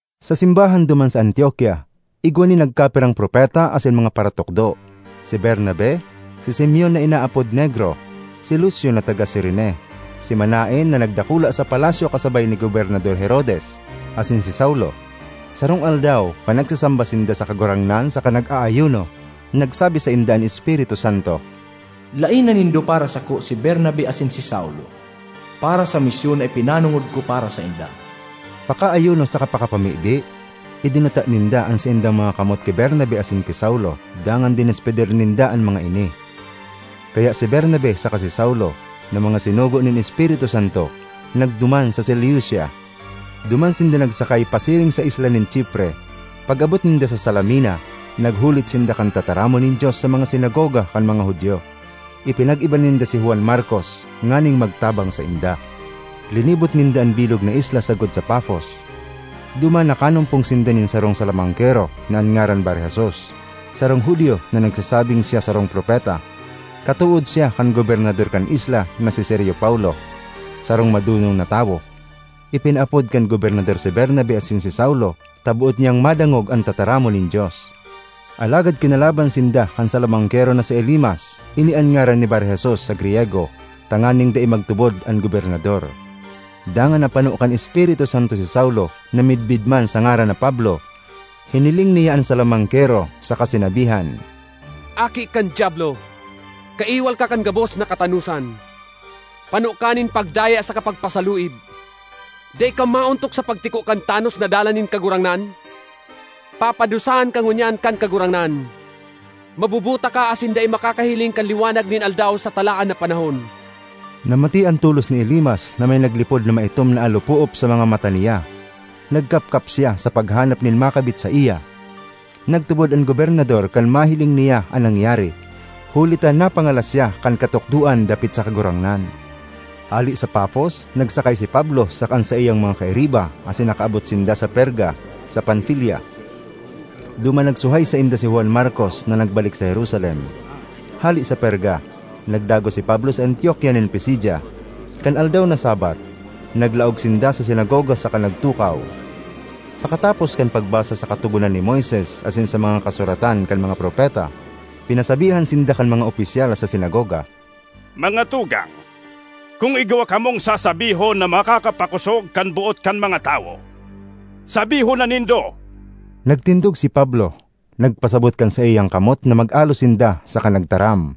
Sa simbahan duman sa Antiokia, igwa nin nagkapirang propeta asin mga paratukdo: si Bernabe, si Simeon (na inaapod Negro), si Lucio (na taga Cirene), si Manaen (na nagdakula sa palasyo kasabay ni Gobernador Herodes), asin si Saulo. Sarong aldaw, kan nagsasamba sinda sa Kagurangnan saka nag-aayuno, nagsabi sainda an Espiritu Santo, “Laena nindo para sako si Bernabe asin si Saulo para sa misyon na ipinanongod ko para sainda.” Pakaayuno saka pakapamibi, idinuta ninda an saindang mga kamot ki Bernabe asin ki Saulo dangan dinespedir ninda an mga ini. Kaya si Bernabe saka si Saulo, na mga sinugo nin Espiritu Santo, nagduman sa Seleucia. Duman sinda nagsakay pasiring sa isla nin Chipre. Pag-abot ninda sa Salamina, naghulit sinda kan tataramon nin Dios sa mga sinagoga kan mga Judio. Ipinag-iba ninda si Juan Markos nganing magtabang sainda. Linibot ninda an bilog na isla sagkod sa Pafos. Duman nakanumpong sinda nin sarong salamangkero na an ngaran Bar-Jesus, sarong Judio na nagsasabing siya sarong propeta. Katood siya kan gobernador kan isla na si Sergio Paulo, sarong madonong na tawo. Ipinaapod kan gobernador si Bernabe asin si Saulo ta boot niyang madangog an tataramon nin Dios. Alagad kinalaban sinda kan salamangkero na si Elimas (ini an ngaran ni Bar-Jesus sa Griyego), tanganing dai magtubod an gobernador. Dangan napano kan Espiritu Santo si Saulo, na midbid man sa ngaran na Pablo; hiniling niya an salamangkero, saka sinabihan, “Aki kan Diablo! Kaiwal ka kan gabos na katanosan; pano ka nin pagdaya saka pagpasaluib! Dai ka maontok sa pagtiko kan tanos na dalan nin Kagurangnan? Papadusahan ka ngunyan kan Kagurangnan; mabubuta ka asin dai makakahiling kan liwanag nin aldaw sa talaan na panahon!” Namatean tolos ni Elimas na may naglipod na maitom na alopoop sa mga mata niya; nagkapkap siya sa paghanap nin makabit saiya. Nagtubod an gobernador kan mahiling niya an nangyari, huli ta napangalas siya kan katukdoan dapit sa Kagurangnan. Hale sa Pafos, nagsakay si Pablo saka an saiyang mga kairiba asin nakaabot sinda sa Perga, sa Panfilia. Duman nagsuhay sainda si Juan Markos na nagbalik sa Jerusalem. Hale sa Perga, nagdagos si Pablo sa Antiokia nin Pisidia. Kan aldaw na Sabbath, naglaog sinda sa sinagoga saka nagtukaw. Pakatapos kan pagbasa sa Katogonan ni Moises asin sa mga kasuratan kan mga propeta, pinasabihan sinda kan mga opisyal sa sinagoga, “Mga tugang, kun igwa kamong sasabihon na makakapakosog kan boot kan mga tawo, sabihon na nindo.” Nagtindog si Pablo, nagpasabot kan saiyang kamot na mag-alo sinda, saka nagtaram: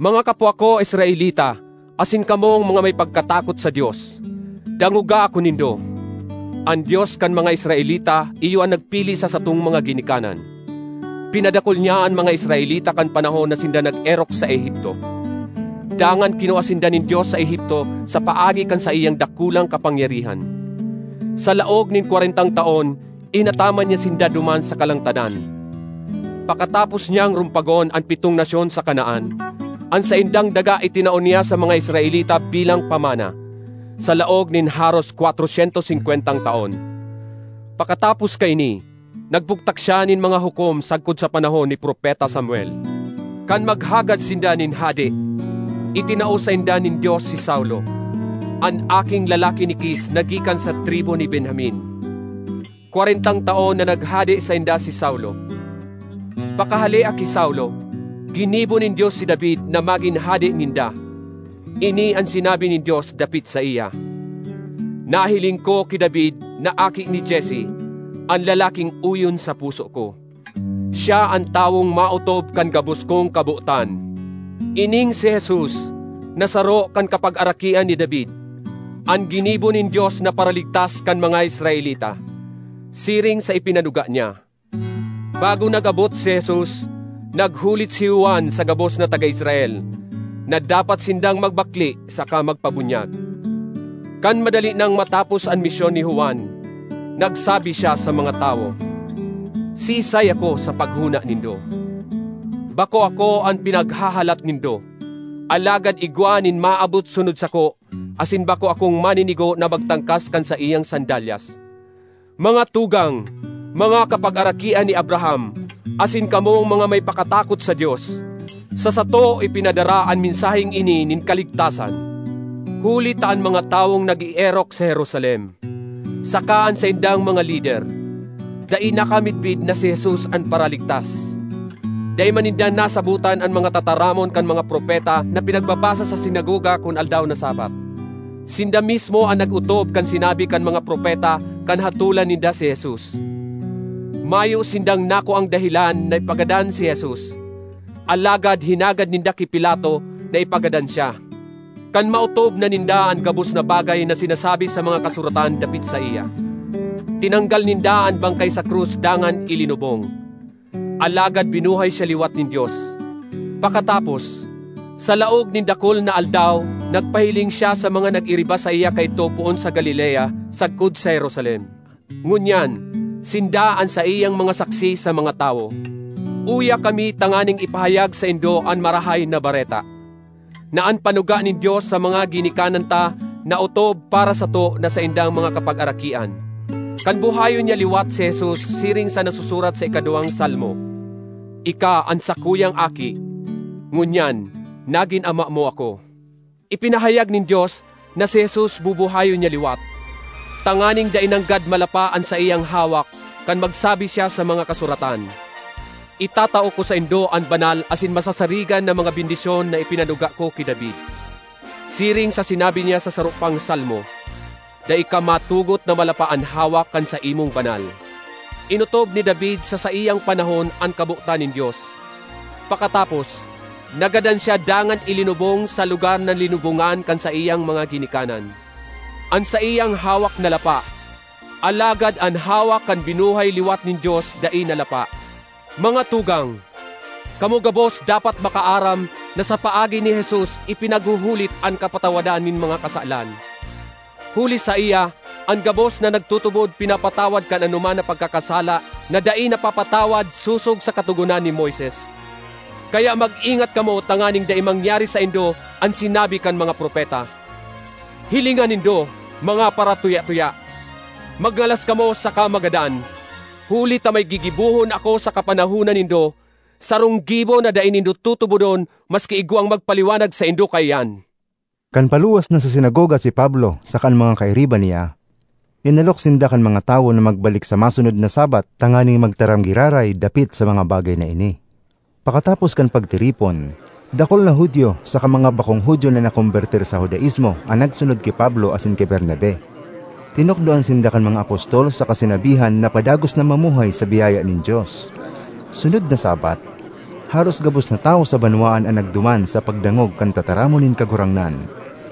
“Mga kapwa ko Israelita asin kamong mga may pagkatakot sa Dios, dangoga ako nindo! An Dios kan mga Israelita iyo an nagpili sa satong mga ginikanan. Pinadakul niya an mga Israelita kan panahon na sinda nag-erok sa Egipto. Dangan kinua sinda nin Dios sa Egipto sa paagi kan saiyang dakulang kapangyarihan. Sa laog nin kwarentang taon inataman niya sinda duman sa kalangtadan. Pakatapos niyang rumpagon an pitong nasyon sa Canaan, an saindang daga itinao niya sa mga Israelita bilang pamana, sa laog nin haros kwatro syentos singkwentang taon. ”Pakatapos kaini nagbugtak siya nin mga hukom sagkod sa panahon ni Propeta Samuel. Kan maghagad sinda nin hade, itinao sainda nin Dios si Saulo, an aking lalaki ni Kis na gikan sa tribu ni Benjamin. Kwarentang taon na naghade sainda si Saulo. Pakahalea ki Saulo, ginibo nin Dios si David na magin hade ninda. Ini an sinabi nin Dios dapit saiya, ‘Nahiling ko ki David na aki ni Jesse an lalaking oyon sa puso ko. Siya an tawong maotob kan gabos kong kabotan.’ Ining si Jesus, na saro kan kapagarakian ni David, an ginibo nin Dios na Paraligtas kan mga Israelita, siring sa ipinanuga niya. Bago nag-abot si Jesus, naghulit si Juan sa gabos na taga Israel, na dapat sindang magbakle saka magpabunyag. Kan madali nang matapos an misyon ni Juan, nagsabi siya sa mga tawo, ‘Siisay ako sa paghona nindo? Bako ako an pinaghahalat nindo. Alagad igwa nin maabot sunod sako asin bako akong maninigo na magtangkas kan saiyang sandalyas.’ ”Mga tugang, mga kapagarakian ni Abraham asin kamong mga may pakatakot sa Dios, sa sato ipinadara an mensaheng ini nin kaligtasan! Huli ta an mga tawong nag-eerok sa Jerusalem, saka an saindang mga lider, dai nakamidbid na si Jesus an Paraligtas. Dai man ninda nasabotan an mga tataramon kan mga propeta na pinagbabasa sa sinagoga kun aldaw na Sabbath; sinda mismo an nag-otob kan sinabi kan mga propeta kan hatolan ninda si Jesus. Mayo sindang nakuang dahelan na ipagadan si Jesus, alagad hinagad ninda ki Pilato na ipagadan siya. Kan maotob na ninda an gabos na bagay na sinasabi sa mga Kasuratan dapit saiya, tinanggal ninda an bangkay sa krus dangan ilinubong. Alagad binuhay siya liwat nin Dios. Pakatapos, sa laog nin dakul na aldaw nagpahiling siya sa mga nag-iriba saiya kaidto poon sa Galilea sagkod sa Jerusalem. Ngunyan, sinda an saiyang mga saksi sa mga tawo. Uya kami tanganing ipahayag saindo an Marahay na Bareta: na an panuga nin Dios sa mga ginikanan ta naotob para sato na saindang mga kapagarakian, kan buhayon niya liwat si Jesus siring sa nasusurat sa ikaduwang Salmo: ‘Ika an sakuyang Aki, ngunyan, nagin Ama mo ako.’ Ipinahayag nin Dios na si Jesus bubuhayon niya liwat, tanganing dai nanggad malapa an saiyang hawak kan magsabi siya sa mga Kasuratan: ‘Itatao ko saindo an banal asin masasarigan na mga bendisyon na ipinanuga ko ki David.’ Siring sa sinabi niya sa saro pang Salmo, ‘Dai ka matugot na malapa an hawak kan saimong banal.’ Inotob ni David sa saiyang panahon an kabotan nin Dios. Pakatapos, nagadan siya dangan ilinubong sa lugar na linubongan kan saiyang mga ginikanan. An saiyang hawak nalapa, alagad an hawak kan binuhay liwat nin Dios dai nalapa. Mga tugang, kamo gabos dapat makaaram na sa paagi ni Jesus ipinaghuhulit an kapatawadan nin mga kasalan. Huli saiya an gabos na nagtutubod pinapatawad kan anoman na pagkakasala na dai napapatawad sosog sa Katogonan ni Moises. Kaya mag-ingat kamo tanganing dai mangyari saindo an sinabi kan mga propeta: ‘Hilinga nindo, mga paratuya-tuya! Magngalas kamo saka magadan! Huli ta may gigibohon ako sa kapanahonan nindo, sarong gibo na dai nindo tutubodon maski igwang magpaliwanag saindo kaiyan!’” Kan paluwas na sa sinagoga si Pablo saka an mga kairiba niya, inalok sinda kan mga tawo na magbalik sa masunod na Sabbath tanganing magtaram giraray dapit sa mga bagay na ini. Pakatapos kan pagtiripon, dakul na Judio saka mga bakong Judio na nakombertir sa Judaismo an nagsunod ki Pablo asin ki Bernabe. Tinukdoan sinda kan mga apostol saka sinabihan na padagos na mamuhay sa biyaya nin Dios. Sunod na Sabbath, haros gabos na tawo sa banwaan an nagduman sa pagdangog kan tataramon nin Kagurangnan.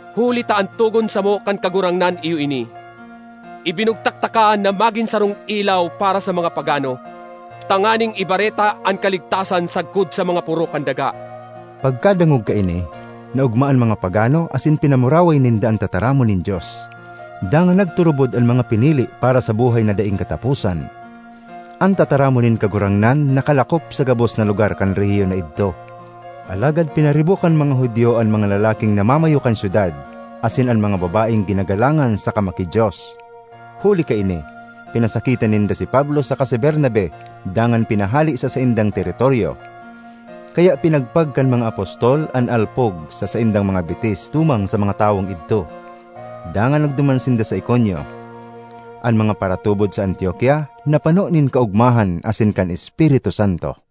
Huli ta an togon samo kan Kagurangnan iyo ini: ‘Ibinugtak taka na magin sarong ilaw para sa mga pagano, tanganing ibareta an kaligtasan sagkod sa mga poro kan daga.’” Pagkadangog kaini, naogma an mga pagano, asin pinamuraway ninda an tataramon nin Dios; dangan nagturubod an mga pinili para sa buhay na daing kataposan. An tataramon nin Kagurangnan nakalakop sa gabos na lugar kan rehiyon na idto. Alagad pinaribok kan mga Judio an mga lalaking namamayo kan syudad asin an mga babaeng ginagalangan saka maki-Dios. Huli kaini, pinasakitan ninda si Pablo saka si Bernabe dangan pinahale sa saindang teritoryo. Kaya pinagpag kan mga apostol an alpog sa saindang mga bitis tumang sa mga tawong idto, dangan nagduman sinda sa Iconio. An mga paratubod sa Antiokia napano nin kaogmahan asin kan Espiritu Santo.